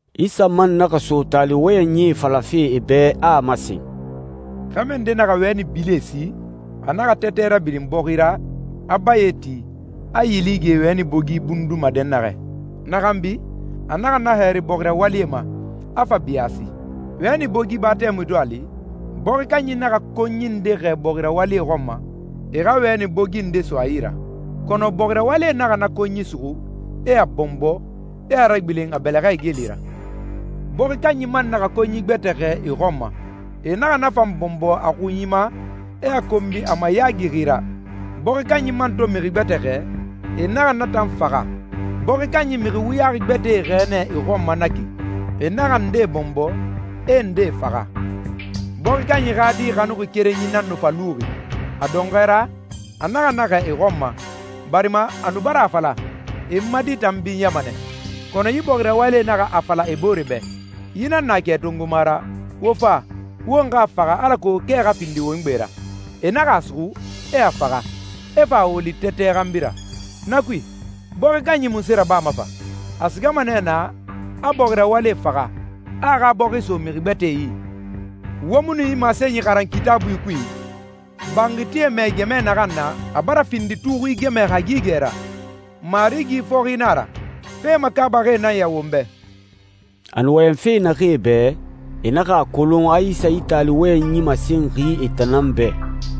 Isa man naxa so taali wɔyɛnyie falafe e bɛ, a a masen, «Xɛmɛ nde naxa wɛni bilie si. A naxa tɛtɛ rabilin bɔxi ra, a baye ti, a yili ge wɛni bogi bunduma dɛnnaxɛ. Na xanbi, a naxa na hɛri bɔxi rawalie ma, a fa biyaasi.» «Wɛni bogi ba tɛmui to a li, bɔxi kanyi naxa konyi nde xɛɛ bɔxi rawalie xɔn ma, e xa wɛni bogi nde so a yi ra. Kɔnɔ, bɔxi rawalie naxa na konyi suxu, e a bɔnbɔ, e a ragbilen a bɛlɛxɛ igeli ra.» «Bɔxi kanyi man naxa konyi gbɛtɛ xɛɛ e xɔn ma. E naxa na fan bɔnbɔ a xunyi ma, e a konbi a mayaagixi ra. Bɔxi kanyi man to mixi gbɛtɛ xɛɛ, e naxa na tan faxa. Bɔxi kanyi mixi wuyaxi gbɛtɛe xɛɛ nɛ e xɔn ma na ki. E naxa ndee bɔnbɔ, e ndee faxa.» «Bɔxi kanyi xa di xanuxi kerenyi nan nu fa luxi. A dɔnxɔɛ ra, a naxa na xɛɛ e xɔn ma, barima a nu bara a fala, ‹E n ma di tan binyama nɛ.› Kɔnɔ yi bɔxi rawalie naxa a fala e bore bɛ, ‹Yi nan na kɛ tongoma ra, wo fa, won xa a faxa alako kɛ xa findi won gbe ra.› E naxa a suxu, e a faxa, e fa a woli tɛtɛ xanbi ra.» «Na kui, bɔxi kanyi munse rabama fa? A sigama nɛ naa, a bɔxi rawalie faxa, a a xa bɔxi so mixi gbɛtɛe yi. Wo mu nu yi masenyi xaran Kitaabui kui? ‹Banxitie mɛɛ gɛmɛ naxan na, a bara findi tuxui gɛmɛ hagigɛ ra. Marigi fɔxi nan a ra. Fe makaabaxi nan ya won bɛ.›» A nu wɔyɛnfe naxee bɛ, e naxa a kolon a Isa yi taali wɔyɛnyi masenxi e tan nan bɛ.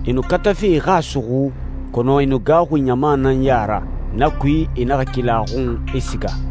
E nu katafe e xa a suxu, kɔnɔ e nu gaaxuxi ɲama nan ya ra. Na kui, e naxa keli a xun, e siga.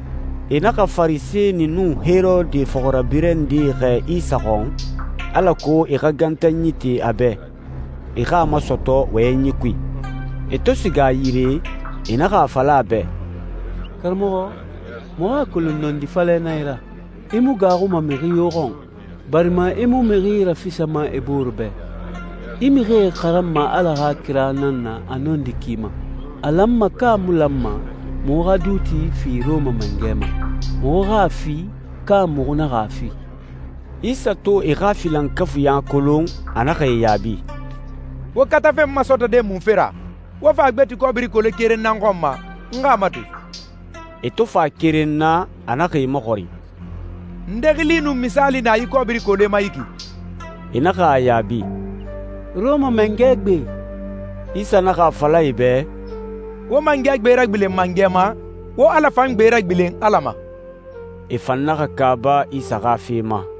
E naxa Farisɛni nun Herode fɔxirabirɛ ndee xɛɛ Isa xɔn alako e xa gantanyi te a bɛ, e xa a masɔtɔ wɔyɛnyi kui. E to siga a yire, e naxa a fala a bɛ, «Karamɔxɔ, muxu a kolon nɔndi falɛ nan i ra. I mu gaaxuma mixi yo xɔn, barima i mu mixi rafisama e booree bɛ. I mixie xaranma Ala xa kira nan na a nɔndi ki ma. A lanma ka a mu lanma muxu xa duuti fi Rɔma mangɛ ma? Muxu xa a fi, ka muxu naxa a fi?» Isa to e xa filankafuiɲa kolon, a naxa e yaabi, «Wo katafe n masɔtɔde munfe ra? Wo fa gbeti kɔbiri kole keren na n xɔn ma, n xa a mato.» E to fa keren na, a naxa e maxɔrin, «Nde xili nun misaali na yi kɔbiri kole ma yi ki?» E naxa a yaabi, «Rɔma Mangɛ gbe.» Isa naxa a fala e bɛ, «Wo mangɛ gbe ragbilen mangɛ ma, wo Ala fan gbe ragbilen Ala ma.» E fan naxa kaaba Isa xa fe ma.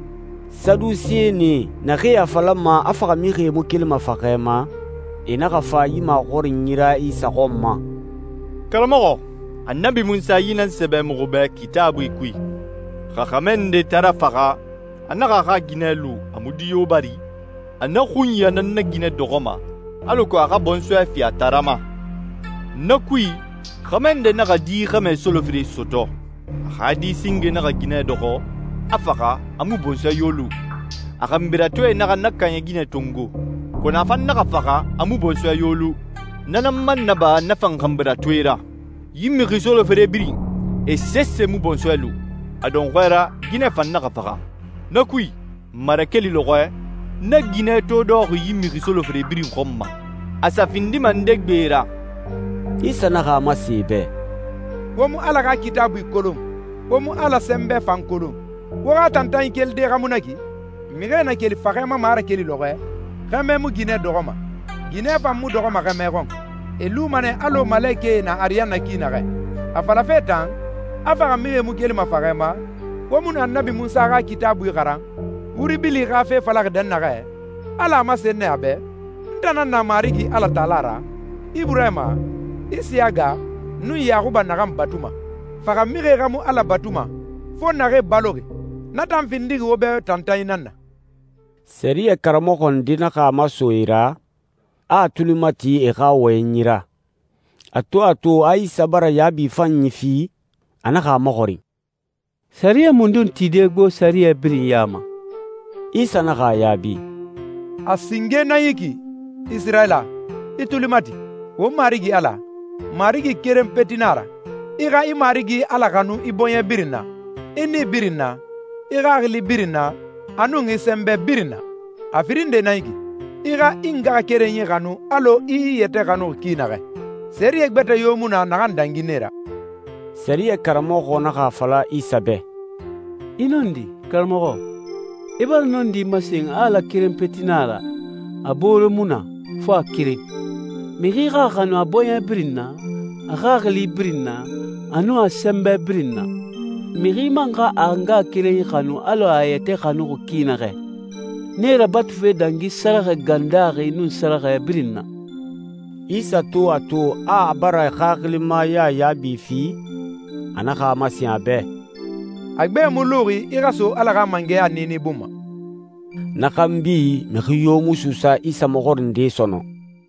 Sadusenie, naxee a falama a faxamixie mu kelima faxɛ ma, e naxa fa yi maxɔrinyi ra Isa xɔn ma, «Karamɔxɔ, Annabi Munsa yi nan sɛbɛ muxu bɛ Kitaabui kui, ‹Xa xɛmɛ nde taara faxa, a naxa a xa ginɛ lu a mu di yo bari, a na xunya nan na ginɛ dɔxɔma, alako a xa bɔnsɔɛ fi a taara ma.› Na kui, xɛmɛ nde naxa di xɛmɛ solofere sɔtɔ. A xa di singe naxa ginɛ dɔxɔ, a faxa, a mu bɔnsɔɛ yo lu. A xanbiratoe naxa na kaaɲɛ ginɛ tongo, kɔnɔ a fan naxa faxa, a mu bɔnsɔɛ yo lu. Na nan man naba na fan xanbiratoe ra. Yi mixi solofere birin, e sese mu bɔnsɔɛ lu. A dɔnxɔɛ ra, ginɛ fan naxa faxa. Na kui, marakeli lɔxɔɛ, na ginɛ to dɔxɔxi yi mixi solofere birin xɔn ma, a sa findima nde gbe ra?» Isa naxa a masen e bɛ, «Wo mu Ala xa Kitaabui kolon, wo mu Ala sɛnbɛ fan kolon. Wo xa tantanyi kelide xa mu na ki? Mixie na keli faxɛ ma marakeli lɔxɔɛ, xɛmɛ mu ginɛ dɔxɔma, ginɛ fan mu dɔxɔma xɛmɛ xɔn. E luma nɛ alɔ malekɛe na ariyanna ki naxɛ. A falafe tan, a faxamixie mu kelima faxɛ ma, wo mu nu Annabi Munsa xa Kitaabui xaran, wuri bili xa fe falaxi dɛnnaxɛ? Ala a masen nɛ a bɛ, ‹N tan nan na Marigi Alatala ra, Iburahima, Isiyaga, nun Yaxuba naxan batuma.› Faxamixie xa mu Ala batuma, fo naxee baloxi. Na tan findixi wo bɛ tantanyi nan na.» Sɛriyɛ karamɔxɔ nde naxa a maso e ra, a a tuli mati e xa wɔyɛnyi ra. A to a to a Isa bara yaabi fanyi fi, a naxa a maxɔrin, «Sɛriyɛ mundun tide gbo sɛriyɛ birin ya ma?» Isa naxa a yaabi, «A singe nan yi ki, ‹Isirayila, i tuli mati, won Marigi Ala, Marigi keren peti na a ra. I xa i Marigi Ala xanu i bɔɲɛ birin na, i nii birin na, i xaxili birin na, a nun i sɛnbɛ birin na.› A firin nde nan yi ki, ‹I xa i ngaxakerenyi xanu alɔ i i yɛtɛ xanuxi ki naxɛ.› Sɛriyɛ gbɛtɛ yo mu na naxan dangi nee ra.» Sɛriyɛ karamɔxɔ naxa a fala Isa bɛ, «I nɔndi, karamɔxɔ. I bara nɔndi masen a Ala keren peti nan a ra, a boore mu na, fo a keren. Mixi xa a xanu a bɔɲɛ birin na, a xaxili birin na, a nun a sɛnbɛ birin na. Mixi man xa a ngaxakerenyi xanu alɔ a a yɛtɛ xanuxi ki naxɛ. Nee rabatufe dangi sɛrɛxɛ gan daaxi nun sɛrɛxɛ birin na.» Isa to a to, a a bara xaxilimaya yaabi fi, a naxa a masen a bɛ, «A gbe mu luxi i xa so Ala xa mangɛya niini bun ma.» Na xanbi, mixi yo mu suusa Isa maxɔrinde sɔnɔn.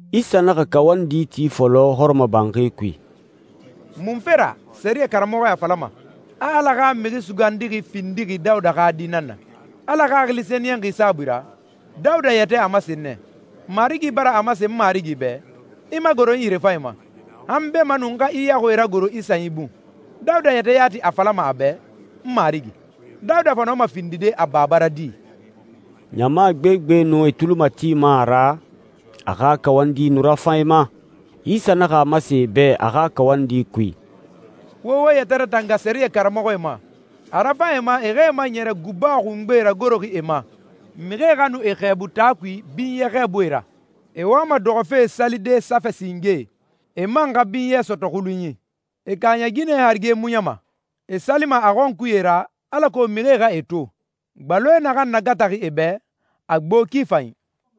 Isa naxa kawandi ti fɔlɔ hɔrɔmɔbanxi kui. «Munfe ra sɛriyɛ karamɔxɔe a falama, a Ala xa Mixi Sugandixi findixi Dawuda xa di nan na? Ala Xaxili Sɛniyɛnxi saabui ra, Dawuda yɛtɛ a masen nɛ, ‹Marigi bara a masen n Marigi bɛ, “I magoro n yirefanyi ma, han beemanun n xa i yaxuie ragoro i sanyi bun.”›» «Dawuda yɛtɛ yati a falama a bɛ, ‹N Marigi›. Dawuda fa nɔma findide a baba ra di?» Ɲama gbegbe nu e tuli matima a ra, a xa kawandi nu rafan e ma. Isa naxa a masen e bɛ a xa kawandi kui, «Wo wo yɛtɛ ratanga sɛriyɛ karamɔxɔe ma. A rafan e ma e xa e maɲɛrɛ guba xungbe ragoroxi e ma, mixie xa nu e xɛɛbu taa kui binyɛ xɛɛbuie ra. E wama dɔxɔfe salide safɛ singee, e man xa binyɛ sɔtɔ xulunyi. E kaaɲɛ ginɛe harige muɲama. E salima a xɔnkuye ra, alako mixie xa e to. Gbaloe naxan nagataxi e bɛ, a gbo ki fanyi.»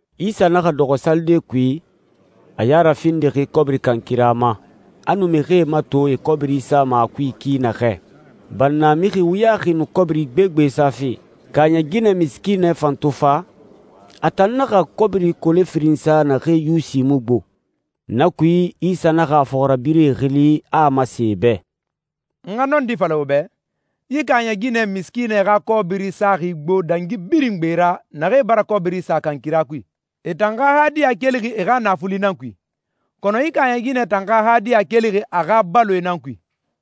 Isa naxa dɔxɔ salide kui, a ya rafindixi kɔbiri kankira ma, a nu mixie mato e kɔbiri sama a kui ki naxɛ. Bannamixi wuyaxi nu kɔbiri gbegbe safe. Kaaɲɛ ginɛ misikiinɛ fan to fa, a tan naxa kɔbiri kole firin sa naxee yusi mu gbo. Na kui, Isa naxa a fɔxirabirɛe xili, a a masen e bɛ, «N xa nɔndi fala wo bɛ, yi kaaɲɛ ginɛ misikiinɛ xa kɔbiri saxi gbo dangi birin gbe ra naxee bara kɔbiri sa kankira kui. E tan xa hadiya kelixi e xa naafuli nan kui, kɔnɔ yi kaaɲɛ ginɛ tan xa hadiya kelixi a xa baloe nan kui.»